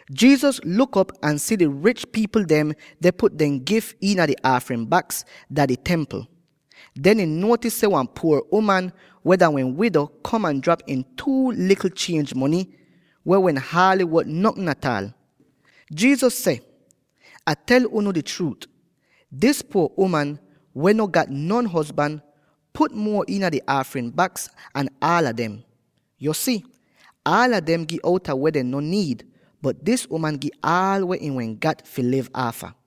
Jesus luk op ahn si di rich pipl dem deh put dehn gif iina di aafrin baks dah di Templ. Den ihn nuotis seh wan puor uman, weh dah wehn wido, kom ahn drap iin two likl chienj mony —weh wehn haaly wot notn ataal. Jesus seh, “Ah deh tel unu di chruut: dis puor uman, weh no gat non hozban, put muo iina di aafrin baks an aala dem. Yo si, aala dem gi outa weh dehn no niid, bot dis uman gi aal weh ihn wehn gat fi liv aafa.”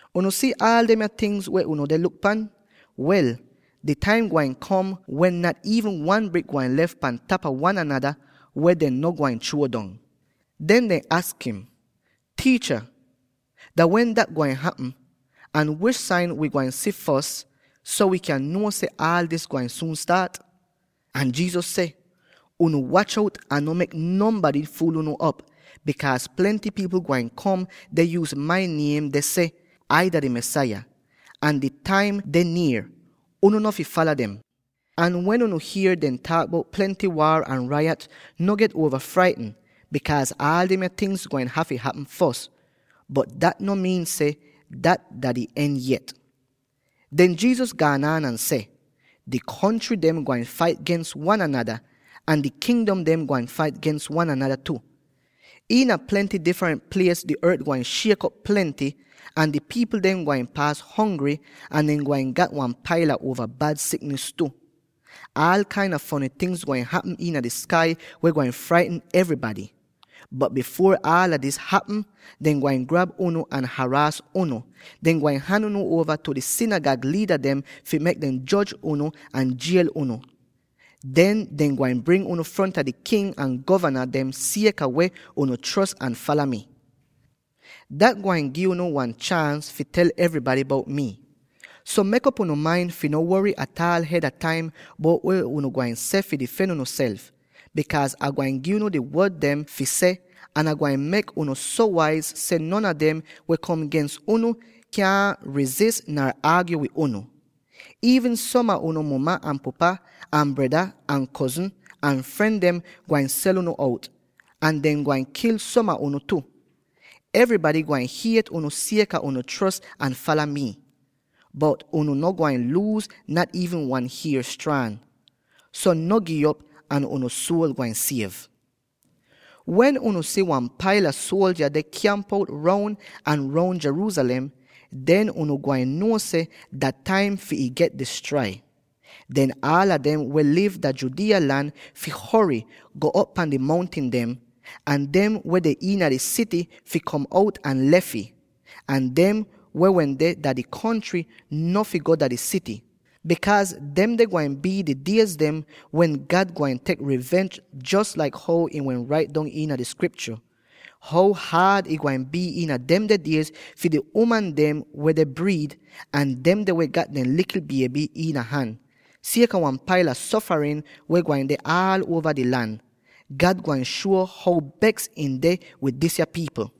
“Unu si aal demya tingz weh unu deh luk pan? Wel, di taim gwain kom wen nat iivn wan brik gwain lef pan tapa wan anada, weh dehn no gwain chruo dong.” Den dehn aks im, “Tiicha, dah wen dat gwain hapm, ahn wish sain wi gwain si fos so wi kyan nuo seh aal dis gwain suun staat?” Ahn Jesus seh, “Unu wach out ahn no mek nonbady fuul unu op; bikaaz plenty pipl gwain kom deh yuuz mai niem deh seh, ‘Ai dah di Mesaya!’ ahn ‘Di taim deh nier!’ Unu no fi fala dem. Ahn wen unu hier dehn taak bout plenty waar ahn rayat, no get uova fraitn, bikaaz aal demya tingz gwain hafy hapm fos, bot dat no miin seh dat dah di en yet.” Den Jesus gaan an ahn seh, “Di kontry dem gwain fait gens wan anada, ahn di kingdom dem gwain fait gens wan anada tu. Iina plenty difrent plies di ort gwain shiek op plenty, ahn di pipl dem gwain paas hongry, ahn dehn gwain gat wan paila uova bad siknis tu. Aal kain a fony tingz gwain hapm iina di skai weh gwain fraitn evrybady. Bot bifuor aal dis hapm, dehn gwain grab unu ahn haraas unu; dehn gwain han unu uova tu di sinigag liida dem fi mek dem joj unu ahn jiel unu. Den dehn gwain bring unu fronta di king ahn govana dem sieka weh unu chros ahn fala mi. Dat gwain gi unu wan chaans fi tel evrybady bout mii. So mek'op unu main fi no wory ataal hed a di taim weh unu gwain seh fi difen unuself, bikaaz Ai gwain gi unu di wod dem fi seh, ahn Ah gwain mek unu so waiz seh non a dem weh kom gens unu kyaahn rizis nar aagyo wid unu. Iivn som a unu muma ahn pupa ahn breda ahn kozn ahn fren dem gwain sel unu out; ahn dehn gwain kil som a unu tu. Evrybady gwain hiet unu sieka unu chros ahn fala mii. Bot unu no gwain luuz nat iivn wan hier straan. So no gi'op ahn unu suol gwain siev! “Wen unu si wan paila suoldya deh kyamp-out roun ahn roun Jerusalem, den unu gwain nuo seh, dah taim fi ih get distrai. Den aala dem weh liv dah Judea lan fi hory, go'op pan di mountin dem, ahn dem weh deh iina di sity fi kom out ahn lef ih, ahn dem weh wende dah di kontry no fi go dah di sity; bikaaz demde gwain bii di die dem wen God gwain tek rivench jos laik how ih wehn rait dong iina di Skriptyo. How haad ih gwain bii iina demde diez fi di uman dem weh deh briid, ahn demde weh gat dehn likl bieby iina han, sieka wan paila sofarin weh gwain deh aal uova di lan. God gwain shuo how beks ihn deh wid disya pipl!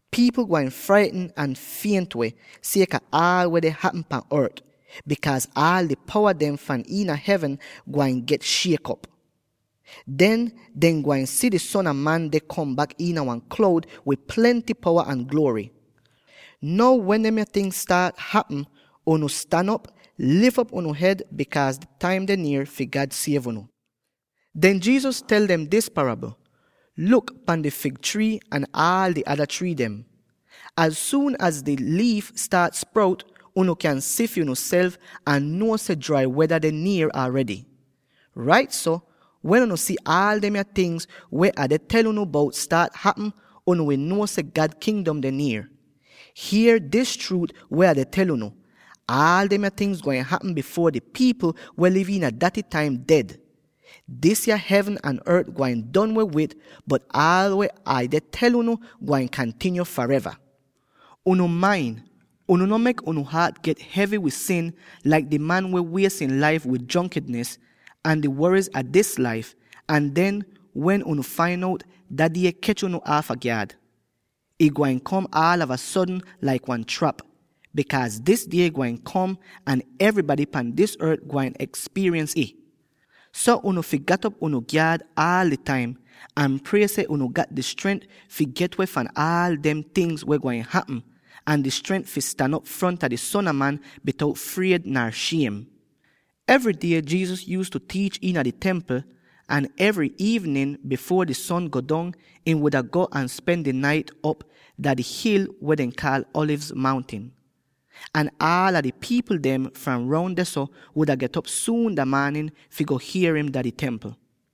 Pipl gwain fraitn ahn fient-weh, sieka aal weh deh hapm pan ort, bikaaz aal di powa dem fahn iina hevn gwain get shiek op. Den, dehn gwain si di Son a Man deh kom bak iina wan kloud wid plenty powa ahn gluory. Now wen demya tingz staat hapm, unu stan op, lif op unu hed, bikaaz di taim deh nier fi God siev unu.” Den Jesus tel dem dis parabl: “Luk pan di fig trii ahn aal di ada trii dem. Az suun az di liif staat sprout, unu kyan si fi unuself ahn nuo seh drai weda deh nier aredy. Rait so, wen unu si aal demya tingz weh Ah deh tel unu bout staat hapm, unu wi nuo seh God Kingdom deh nier. “Hier dis chruut weh Ah deh tel unu: Aal demya tingz gwain hapm bifuor di pipl weh deh liv iina daty taim ded. Disya hevn ahn ort gwain don weh wid, bot aal weh Ai deh tel unu gwain kantinyo fareva. “Unu main, unu no mek unu haat get hevy wid sin, laik di man weh wies ihn laif wid jronkinis, ahn di woriz a dis laif; ahn den, wen unu fain out, Dah Die kech unu aafa gyaad. Ih gwain kom aalava sodn laik wan trap; bikaaz dis die gwain kom, ahn evrybady pan dis ort gwain ekspiriens ih. So unu fi gat op unu gyaad aal di taim, ahn prie seh unu gat di strent fi get-weh fahn aal dem tingz weh gwain hapm, ahn di strent fi stan op fronta di Son a Man bitout fried nar shiem.” Evry die Jesus yuuztu tiich iina di Templ, ahn evry iivnin bifuor di son go dong ihn wuda go ahn spen di nait op dah di hil weh dehn kaal Alivz Mountin. Ahn aal di pipl dem fram roun dehso wuda get'op suun dah maanin fi go hier im dah di Templ.